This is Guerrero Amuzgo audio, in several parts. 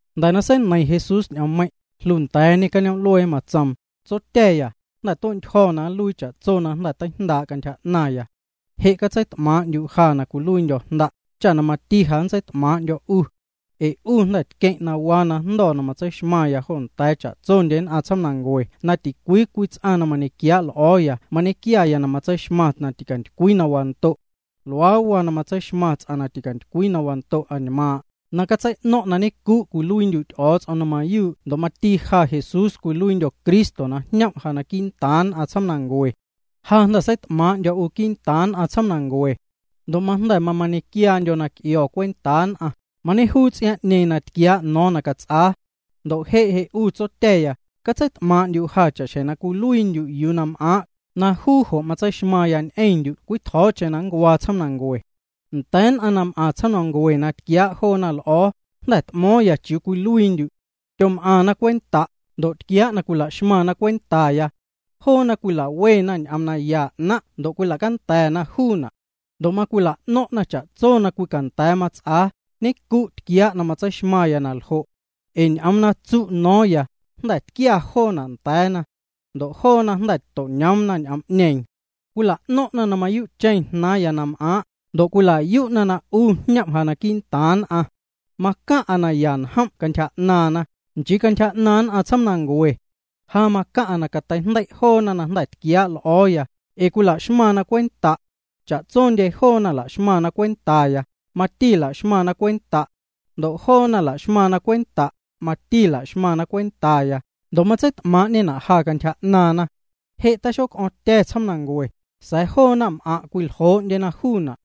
Jnda̱ na seineiⁿ Jesús ñ'oommeiⁿ', jlunda̱a̱ñê cañoom'luee. Matsoom: —Tsotya̱ya, jnda̱ tue'ntyjo̱ na nluii cha'tso na teijndaa' cantyja 'naⁿya. Je' catseit'maaⁿ'ndyu' ja na cwiluiindyo̱ Jnda', cha mati ja nntseit'maaⁿ'ndyo̱ 'u. Ee 'u jnda̱ tqueⁿ' na waa na jndo̱ na matseixmaⁿya jo nda̱a̱ cha'tso nn'aⁿ tsjoomnancue na ticwii cwii ts'aⁿ na mañequiaa' l'o̱o̱ya na nñequiaya na tseixmaⁿ na ticantycwii na wando'. Luaa waa na nntseixmaⁿ ts'aⁿ na ticantycwii na wando' añmaaⁿ'aⁿ, na catsei'no̱o̱ⁿ'o̱ⁿ na ñenncu'cheⁿ' cwiluiindyu' Ty'o̱o̱ts'om na mayuu' ndo' mati na ja Jesús cwiluiindyo̱ Cristo na jñom' ja quii'ntaaⁿ nn'aⁿ tsjoomnancue. ’Ja jnda̱ seit'maaⁿ'ndyo̱ 'u quii'ntaaⁿ nn'aⁿ tsjoomnancue. Ndo' majnda̱ mamañequiaandyo̱ na c'io̱ cwentaa nn'aⁿ, mañejuu ts'iaaⁿ'ñeeⁿ na tquiaa' no̱o̱ⁿ na cats'aa. Ndo' je' je' 'u Tsotya̱ya, catseit'maaⁿ'ndyu' ja cha'xjeⁿ na cwiluiit'maⁿndyu' yuu na m'aaⁿ', na juu jo' matseixmaⁿya ñ'eⁿndyu' cwii tjo̱o̱cheⁿ na nncuaa tsjoomnancue. ’Nda̱a̱ nn'aⁿ na m'aⁿ tsjoomnancue na tquiaa' joona l'o̱o̱, jnda̱ t'mo̱o̱ⁿya chiuu cwiluiindyu'. Tyom'aⁿna cwenta', ndo' tquiaa' na cwila'xmaⁿna cwentaya. Joona cwila'wena ñ'oom naya 'naⁿ' ndo' cwila'canda̱na juuna'. Ndo' macwila'no̱ⁿ'na na cha'tso na cwicanda̱a̱ mats'aa, ñenncu' tquiaa' na matseixmaⁿya na ljo'. Ee ñ'oom na tsu' no̱o̱ⁿya, jnda̱ tquia joona' nda̱a̱na. Ndo' joona jnda̱ to'ñoomna ñ'oom'ñeeⁿ. Cwila'no̱ⁿ'na na mayuu'cheⁿ jnaaⁿya na m'aaⁿ', ndo' cwila'yu'na na 'u jñom' ja quii'ntaaⁿ nn'aⁿ. ’Macaⁿ'a naya njom' cantyja 'naaⁿna, nchii cantyja 'naaⁿ nn'aⁿ tsjoomnancue. Ja macaⁿ'a na cateijndei' joo na jnda̱ tquiaa' l'o̱o̱ya, ee cwila'xmaⁿna cwenta'. Cha'tsondye joona na la'xmaⁿna cwentaya, mati la'xmaⁿna cwenta'. Ndo' joona na la'xmaⁿna cwenta', mati la'xmaⁿna cwentaya, ndo' matseit'maaⁿ'ñena' ja cantyja 'naaⁿna. ’Je' taxoc'o̱o̱ⁿtya̱ tsjoomnancue, sa̱a̱ joo naⁿm'aⁿ' cwiljoo'ndyena juuna',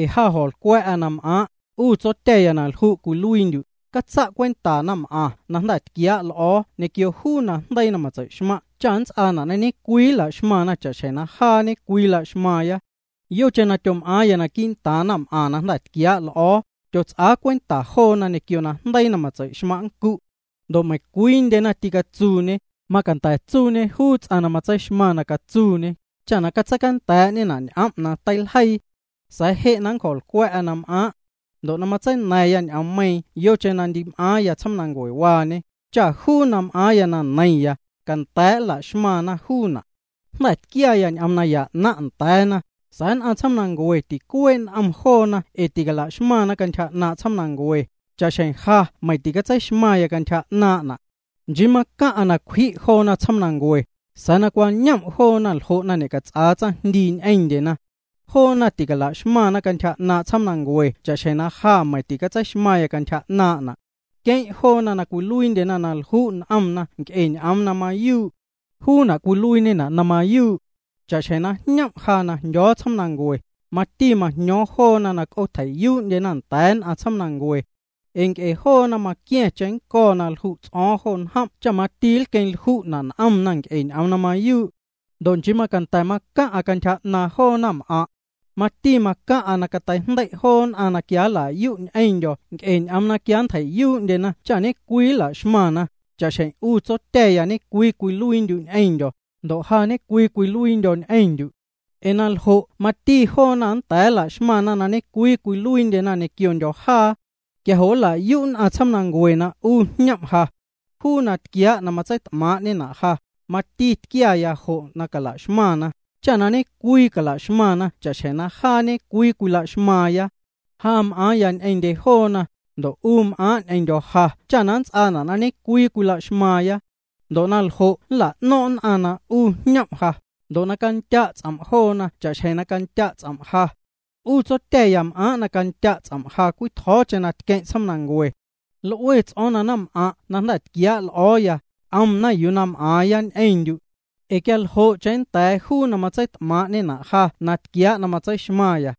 ee ja jo̱nlcwa̱'a na m'aaⁿ'. 'U Tsotya̱ya na lju' cwiluiindyu', catsa' cwenta naⁿm'aⁿ na jnda̱ tquiaa' l'o̱o̱ ñequio juu najndeii na matsei'xmaⁿ' cha nnts'aana' ñe'cwii nla'xmaⁿna cha'xjeⁿ jaa ñe'cwii cwilaxmaaⁿya. Yocheⁿ na tyom'aaⁿya naquii'ntaaⁿ naⁿm'aⁿ na jnda̱ tquiaa' l'o̱o̱, tyots'aa cwenta joona ñequio najndeii na matsei'xmaⁿ' nncu'. Ndo' meiⁿcwiindyena tîcatsuuñe, macanda̱ tsuuñe juu ts'aⁿ na matseixmaⁿ na catsuuñe, cha na catseicanda̱a̱'ñena' ñ'om' na teiljeii. ’Sa̱a̱ je' na nncjo̱lcwa̱'a na m'aaⁿ'. Ndo' matseina̱ⁿya ñ'oommeiiⁿ yocheⁿ na ndi m'aaⁿya tsjoomnancuewaañe, cha juu na m'aaⁿya na neiⁿya, canda̱a̱' nla'xmaⁿna juuna'. Jnda̱ tquiaya ñ'oom naya 'naⁿ' nda̱a̱na, sa̱a̱ nn'aⁿ tsjoomnancue ticuee' n'om joona ee ticala'xmaⁿna cantyja 'naaⁿ' tsjoomnancue, cha'xjeⁿ ja meiⁿ ticatseixmaⁿya cantyja 'naaⁿ'na'. Nchii macaⁿ'a na cwji' joona tsjoomnancue, sa̱a̱ na cwañom' joona ljo' na ñe'cats'aa tsaⁿjndii ñ'eⁿndyena. Joona ticalaxmaⁿna cantyja 'naaⁿ' tsjoomnancue cha'xjeⁿ ja meiⁿ ticatseixmaⁿya cantyja 'naaⁿ'na'. Queⁿ' joona na cwiluiindyena na lju' n'omna nc'e ñ'oom na mayuu'. Juuna' cwiluiiñena' na mayuu'. Cha'xjeⁿ na jñom' ja na jndyo̱o̱ tsjoomnancue, mati majño̱o̱ⁿya joona na c'oocatjei'yuu'ndyena nda̱a̱ nn'aⁿ tsjoomnancue. Ee nc'e joona maqua̱ⁿ cheⁿnnco̱ na lju' ts'o̱o̱ⁿ jo njom' cha mati nlqueⁿlju'na' n'omna nc'e ñ'oom na mayuu'. ’Ndo' nchii macanda̱ macaⁿ'a cantyja 'naaⁿ joo naⁿm'aⁿ'. Mati macaⁿ'a na cateijndei' joo nn'aⁿ na quia nla'yu' ñ'eⁿndyo̱ nc'e ñ'oom na quia nntjei'yuu'ndyena cha ñe'cwii nla'xmaⁿna, cha'xjeⁿ 'u Tsotya̱ya ñe'cwii cwiluiindyu' ñ'eⁿndyo̱, ndo' ja ñe'cwii cwiluiindyo̱ ñ'eⁿndyu'. Ee na ljo' mati joona nnda̱a̱ nla'xmaⁿna na ñe'cwii cwiluiindyena ñequiondyo̱ jaa. Quia jo' nla'yu' nn'aⁿ tsjoomnancue na 'u jñom' ja. Juu na tquiaa' na matseit'maaⁿ'ñena' ja, mati tquiaya jo' na cala'xmaⁿna, cha na ñe'cwii cala'xmaⁿna cha'xjeⁿ jaa ñe'cwii cwila'xmaaⁿya. Ja m'aaⁿya ñ'eⁿndye joona, ndo' 'u m'aaⁿ' ñ'eⁿndyo̱ ja cha nnts'aana' na ñe'cwii cwila'xmaⁿna. Ndo' na ljo' nla'no̱ⁿ' nn'aⁿ na 'u jñom' ja, ndo' na candya' ts'om' joona cha'xjeⁿ na candya' ts'om' ja. ’'U Tsotya̱ya m'aaⁿ' na candya' ts'om' ja cwii tjo̱o̱cheⁿ na tqueⁿ' tsjoomnancue. L'ue ts'o̱o̱ⁿ na naⁿm'aⁿ' na jnda̱ tquiaa' l'o̱o̱ya, c'omna yuu na m'aaⁿya ñ'eⁿndyu'. Ee quia ljo'cheⁿ nnda̱a̱ juu na matseit'maaⁿ'ñena' ja na tquiaa' na matseixmaⁿya.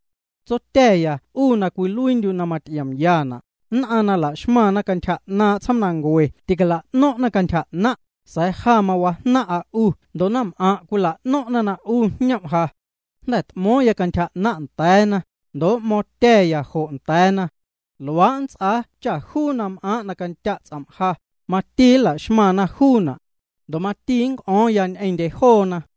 Tsotya̱ya 'u na cwiluiindyu' na maty'iomyana', nn'aⁿ na la'xmaⁿna cantyja 'naaⁿ' tsjoomnancue ticala'no̱ⁿ'na cantyja 'naⁿ', sa̱a̱ ja mawajnaⁿ'a 'u ndo' naⁿm'aⁿ' cwila'no̱ⁿ'na na 'u jñom' ja. Jnda̱ t'mo̱o̱ⁿya cantyja 'naⁿ' nda̱a̱na, ndo' m'mo̱o̱ⁿtya̱ya jo' nda̱a̱na. Luaa' nnts'aa cha juu na m'aaⁿ' na candya' ts'om' ja, mati nlaxmaⁿna juuna'. Ndo' mati nnc'o̱o̱ⁿya ñ'eⁿndye joona.